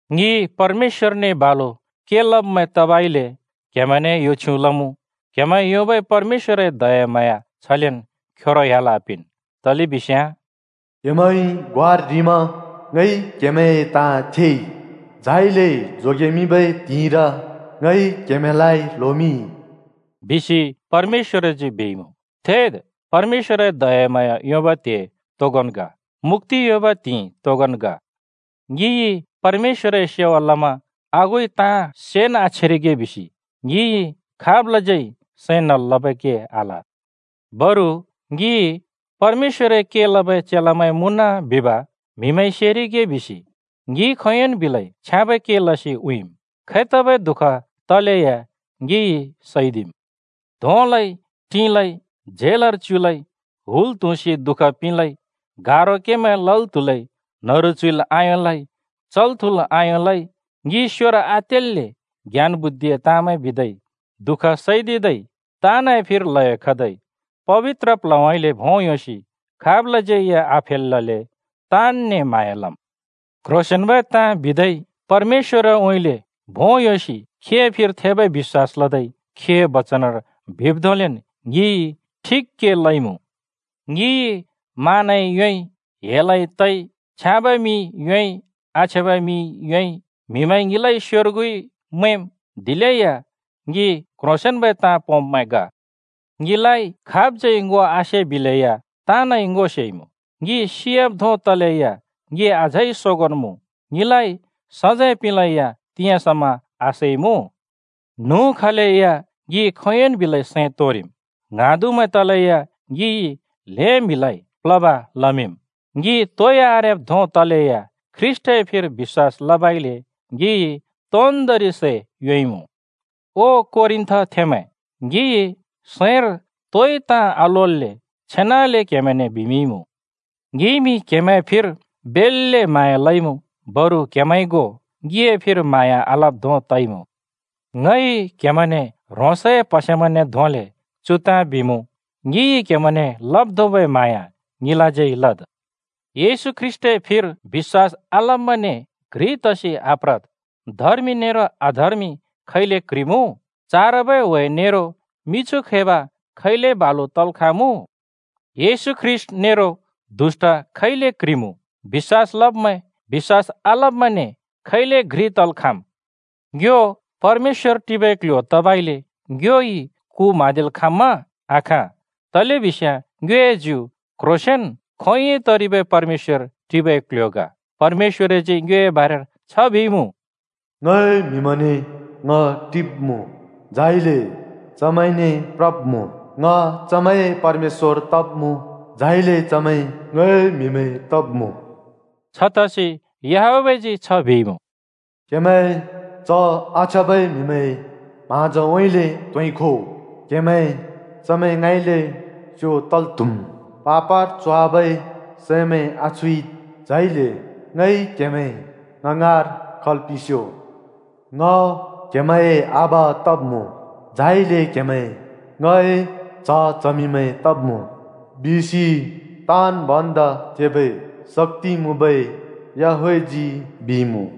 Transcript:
ङि परमेश्‍वरने बालु के लब्मैं तबइले क्‍हेमैंने यो छ्युँ लमुँ, क्‍हेमैंइ योंबै परमेश्‍वरए दयाम्हाँया छलेन् खेरो ह्‍याल् आपिंन्। तलेबिस्याँ “क्‍हेमैंइ ग्वार ह्रिमा ङइ क्‍हेमैंए ताँ थेइ, झाइले जोगेमिंबै त्हिंइर ङइ क्‍हेमैंलाइ ल्होमिंइ।” बिसि परमेश्‍वरजी बिइमुँ। थेद्, परमेश्‍वरए दयाम्हाँया योंबै त्हे तोगोंन् ग, मुक्‍ति योंबै त्हिंइ तोगोंन् ग। ङिइ परमेश्‍वरए सेवा लमा आगुइ ताँ सेन् आछेरिगे बिसि ङिइ खाबलाज्यै सैं नल् लबै के आल। बरु ङि “परमेश्‍वरए के लबै चेलामैं मुँन” बिब म्‍हिमैंइ सेरिगे बिसि ङिइ खोंयोंन् बिलै छ्याँबै के लसि उँइँम्। खैतबै दुःखन् तलेया ङिइ सैदिम्। धोंलै, टिंलै, झेलर च्युलै, हुल त्हुँसि दुःख पिंलै, गारो केमैं लल् त्‍हुलै, न्‍हरु च्‍हुइल् आयोंलै, चल्-थुँल् आयोंलै, ङि स्योर आतेल्‍ले, ज्ञान-बुद्धिए ताँमैं बिदै, दुःख सैदिदै, ताँनए फिर ल्हयो खदै, पबित्र प्ल्हउँइँले भों योंसि खाबलाज्यै या आफेलल्‍ले ताँनने म्हाँया लम्। क्ह्रोंसेंन्बै ताँ बिदै, परमेश्‍वरउँइँले भों योंसि खीए फिर थेबै बिश्‍वास लदै खीए बचनर बिब् धोंलेन् ङिइ ठिक के लइमुँ। ङिइ मानै योंइ, हेलै तइ। छ्याँब मिं योंइ, आछ्याँब मिं योंइ। म्‍हिमैंइ ङिलाइ स्‍योर्गु मैंम्, दिलेया ङि क्‍ह्रोंसेंन्‍बै ताँ पोंब्मैं ग। ङिलाइ खाबज्यै ङो आसे बिलेया ताँनइ ङो सेइमुँ। ङि सियाब् धों तलेया ङि अझै सोगोंन् मुँ। ङिलाइ सजैं पिंलेया तिंयाँ समा आसैइमुँ। न्हुँ खलेया ङि खोंयोंन् बिलै सैं तोंरिम्, ङ्हाँदुमैं तलेया ङिइ ल्हें म्‍हिमैंलाइ प्‍ल्होब लमिंम्, ङि तोइ आरेब् धों तलेया ख्रीष्‍टए फिर बिश्‍वास लबइले ङिइ तोन्दोंरि सै योंइमुँ। ओ कोरिन्‍थथेंमैं, ङिइ सैंर तोइ ताँ आलोल्‍ले छेनाले क्हेमैने बिमिंइमुँ। ङिइमि क्‍हेमैंए फिर बेल्‍ले म्हाँया लइमुँ, बरु क्‍हेमैंइ गो ङिए फिर म्हाँया आलब् धों तइमुँ। ङइ क्‍हेमैंने ह्रोंसए प्‍हसेमैंने धोंले चु ताँ बिमुँ: ङिइ क्‍हेमैंने लब् धोंबै म्हाँया ङिलाज्यै लद्। येशू ख्रीष्‍टए फिर बिश्‍वास आलब्‍मैंने घ्रि तसि आप्रद्। धर्मि नेरो अधर्मि खैले क्‍ह्रिमुँ? चारबै ह्‍वे नेरो मिछु खैब खैले बालु तल् खाँमुँ? येशू ख्रीष्‍ट नेरो दुष्‍ट खैले क्‍ह्रिमुँ? बिश्‍वास लब्मैं बिश्‍वास आलब्‍मैंने खैले घ्रि तल् खाँम्? ङ्यो परमेश्‍वर टिबै क्‍ल्‍ह्‍यो तबइले ङ्योइ कु म्हाँदिल् खाँम्मा? आखाँ! तलेबिस्याँ ङ्योए ज्यु क्ह्रोंसेंन खोंयोंइ तरिबै परमेश्‍वर टिबै क्‍ल्‍ह्‍यो ग। परमेश्‍वरजी ङ्योए बारेर छ बिइमुँ: “ङए म्‍हिमैंने ङ टिब्‍मुँ, झाइले चमैंने प्रब्मुँ। ङ चमैंए परमेश्‍वर तब्‍मुँ, झाइले चमैं ङए म्हिमैं तब्‍मुँ।” छतसि याहवेहजी छ बिइमुँ: “क्‍हेमैं च आछ्याँबै म्‍हिमैंए म्हाँजोउँइँले त्होंइ खो, क्‍हेमैं चमैं ङाँइले स्‍यो तल् त्‍हुम्। पापर च्होवाबै सैमैं आछुइद्, झाइले ङइ क्‍हेमैं ङ ङाँर खल् पिंस्‍यो। ङ क्‍हेमैंए आबा तब्‍मुँ, झाइले क्‍हेमैं ङए च्‍ह-चमिंमैं तब्‍मुँ। बिसि ताँन् भन्दा थेबै शक्‍ति मुँबै याहवेहजी बिइमुँ।”